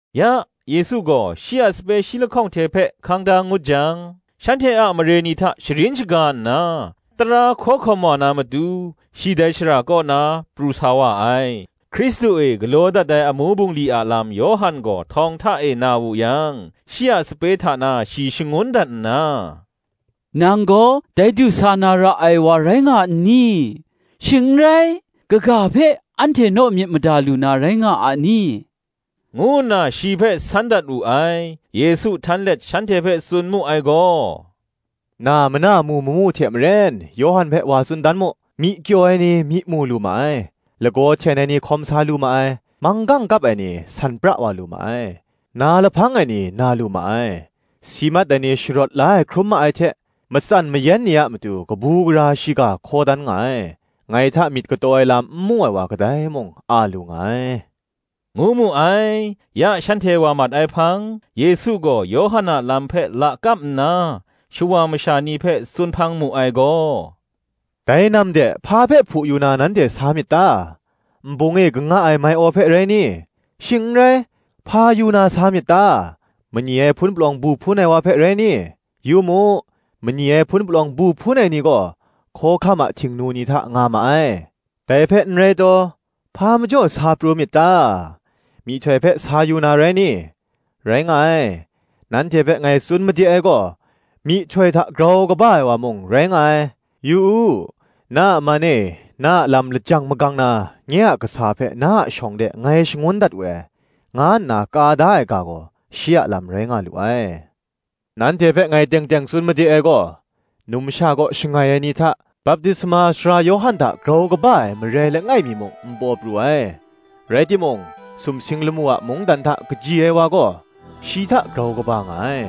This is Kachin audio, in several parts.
Ya, Yesu gaw shi a sape shi lahkawng hte hpe hkang da ngut yang, shanhte a mare ni hta sharin shaga nna, tara hkaw hkawm wa na matu, shi dai shara kaw na pru sa wa ai. Hkristu e galaw dat ai amu bungli a lam Yawhan gaw htawng hta e na wu yang shi a sape hta na shi shangun dat nna, “Nang gaw dai du sa na ra ai wa rai nga n ni? shing n rai, kaga hpe anhte naw myit mada lu na rai nga a ni?” ngu nna shi hpe san dat wu ai. Yesu htan let shanhte hpe tsun mu ai gaw, “Na mana mu mamu hte maren, Yawhan hpe wa tsun dan mu: myi kyaw ai ni myi mu lu ma ai, lagaw hten ai ni hkawm sa lu ma ai, manggang kap ai ni san pra wa lu ma ai, na lahpang ai ni na lu ma ai, si mat ai ni sharawt la ai hkrum ma ai hte, matsan mayan ni a matu kabu gara shiga hkaw dan nga ai: ngai hta myit kataw ai lam n mu ai wa kadai mung, a lu nga ai,” ngu mu ai. Ya shanhte wa mat ai hpang, Yesu gaw Yawhan a lam hpe lakap nna shawa masha ni hpe tsun hpang mu ai gaw, “Dai nam de, hpa hpe hpu yu na, nanhte sa myit ta? nbung e kanga ai mai-aw hpe rai ni? shing n rai, hpa yu na sa myit ta? mani ai hpun palawng bu hpun ai wa hpe, rai ni? Yu mu, mani ai hpun palawng bu hpun ai ni gaw, hkawhkam a htingnu ni hta nga ma ai. Dai hpe n rai taw, hpa majaw sa pru myit ta? myihtoi hpe sa yu na rai ni? Rai nga ai; nanhte hpe ngai tsun made ai gaw, myihtoi hta grau kaba ai wa mung rai nga ai. ‘Yu u, na a man e, na a lam lajang magang na, Nye a kasa hpe na a shawng de ngai shangun dat we ai,' nga nna ka da ai ga gaw shi a lam rai nga lu ai. Nanhte hpe ngai teng teng tsun made ai gaw, Numsha kaw shangai ai ni hta, Baptisma Sara Yawhan hta grau kaba ai marai langai mi muk n paw pru ai: rai timung, sumsing lamu a mungdan hta kaji ai wa gaw, shi hta grau kaba nga ai.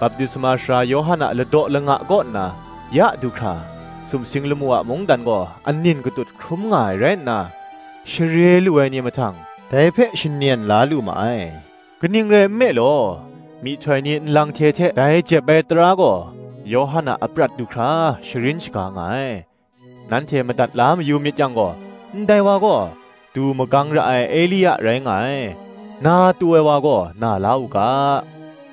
Baptisma Sara Yawhan a ladaw langa kaw nna ya du hkra, sumsing lamu a mungdan gaw anin katut hkrum nga ai rai nna, share lu ai ni mahtang, dai hpe shanyen la lu ma ai. Kaning rai nme law, myihtoi ni nlang hte hte dai jep ai tara gaw, Yawhan a aprat du hkra sharin shaga nga ai: nanhte madat la mayu myit yang gaw, ndai wa gaw, du magang ra ai Elia rai nga ai. Na tu ai wa gaw, na la u ga.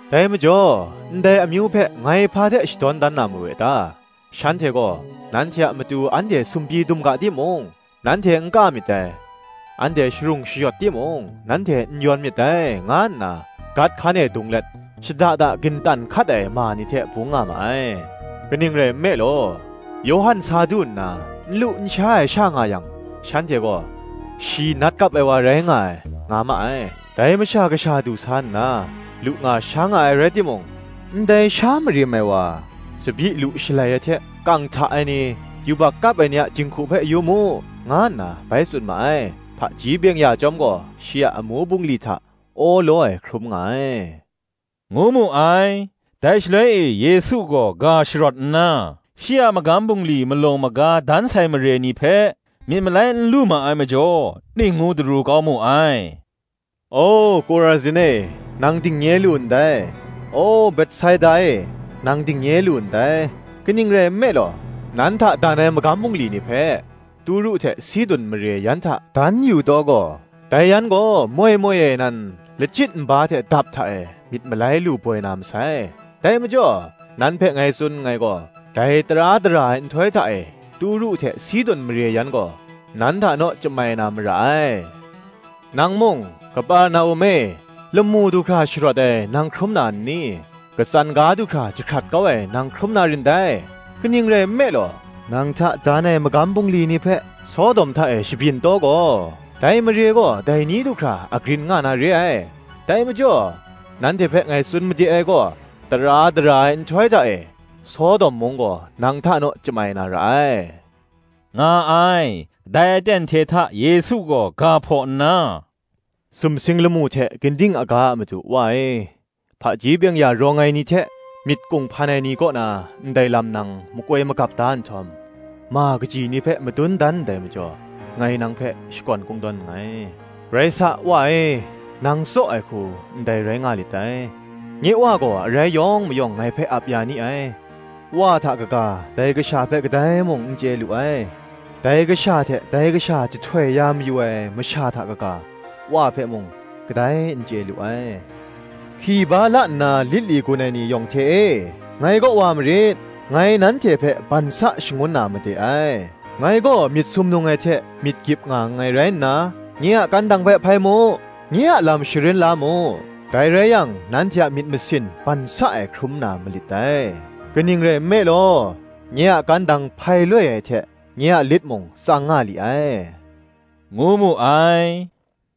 Dai majaw, ndai amyu hpe, ngai hpa hte shadawn dan na mawe ta? Shanhte gaw, Nanhte a matu anhte sumpyi dum ga timung, nanhte n ka myit dai: Anhte sharung shayawt timung, nanhte n yawn myit dai, nga nna, gat hkan e dung let, shada da gintan hkat ai ma ni hte bung nga ma ai. Kaning rai nme law, Yawhan sa du nna n lu n sha ai sha nga yang, shanhte gaw, Shi nat kap ai wa rai nga ai, nga ma ai: Dai Masha Kasha du sa nna, lu nga sha nga ai rai timung, Ndai sha marim ai wa, tsabyi lu shalai ai hte, kang hta ai ni, yubak kap ai ni a jinghku hpe yu mu, nga nna bai tsun ma ai. Hpaji byeng-ya chyawm gaw, shi a amu bungli hta awlaw ai hkrum nga ai,” ngu mu ai. Dai shaloi e Yesu gaw ga sharawt nna, shi a magam bungli malaw maga dan sai mare ni hpe, myit malai n lu ma ai majaw, ning ngu daru kau mu ai: “O, Kurazin e, nang dingnye lu ndai! O, Betsaida e, nang dingnye lu ndai! Kaning rai nme law, nan hta dan ai magam bungli ni hpe, Turu hte Sidun mare yan hta dan yu taw gaw, dai yan gaw moi moi e nan lachyit nba hte dap hta e, myit malai lu boi na masai. Dai majaw, nan hpe ngai tsun nngai gaw, dai tara dara ai nhtoi hta e, Turu hte Sidun mare yan gaw, nan hta naw chyamai na mara ai. Nang mung, Kaperna-um e, lamu du hkra sharawt ai, nang hkrum na n ni? katsan ga du hkra jahkrat kau ai nang hkrum na rin dai. Kaning rai nme law, nang hta dan ai magam bungli ni hpe, Sodom hta e shabyin taw gaw, dai mare gaw dai ni du hkra agrin nga na re ai. Dai majaw nanhte hpe ngai tsun made ai gaw, tara dara ai nhtoi hta e, Sodom mung gaw, nang hta naw chyamai na ra ai,” nga ai. Dai aten hte hta Yesu gaw ga hpaw nna, “Sumsing lamu hte ginding aga a Madu, Wa e; hpaji byeng-ya rawng ai ni hte myit kunghpan ai ni kaw na ndai lam nang makoi magap da nhtawm, ma kaji ni hpe madun dan ndai majaw, ngai nang hpe shakawn kungdawn nngai: rai sa, Wa e, nang tsaw ai hku, ndai rai nga lit dai. Nye Wa gaw arai yawng mayawng ngai hpe ap ya ni ai; Wa hta kaga, dai kasha hpe kadai mung n chye lu ai: dai Kasha hte, dai Kasha jahtoi ya mayu ai masha hta kaga, Wa hpe mung, kadai n chye lu ai. Hki ba la nna lit li gun ai ni yawng hte e, ngai kaw wa marit; ngai nanhte hpe ban sa shangun na made ai. Ngai gaw myit sumnung ai hte myit gyip nga nngai rai nna nye a kandang hpe hpai mu, nye a lam sharin la mu: dai rai yang nanhte a myit masin ban sa ai hkrum na malit dai: kaning rai nme law, nye a kandang hpai loi ai hte, nye a lit mung tsang nga li ai,” ngu mu ai.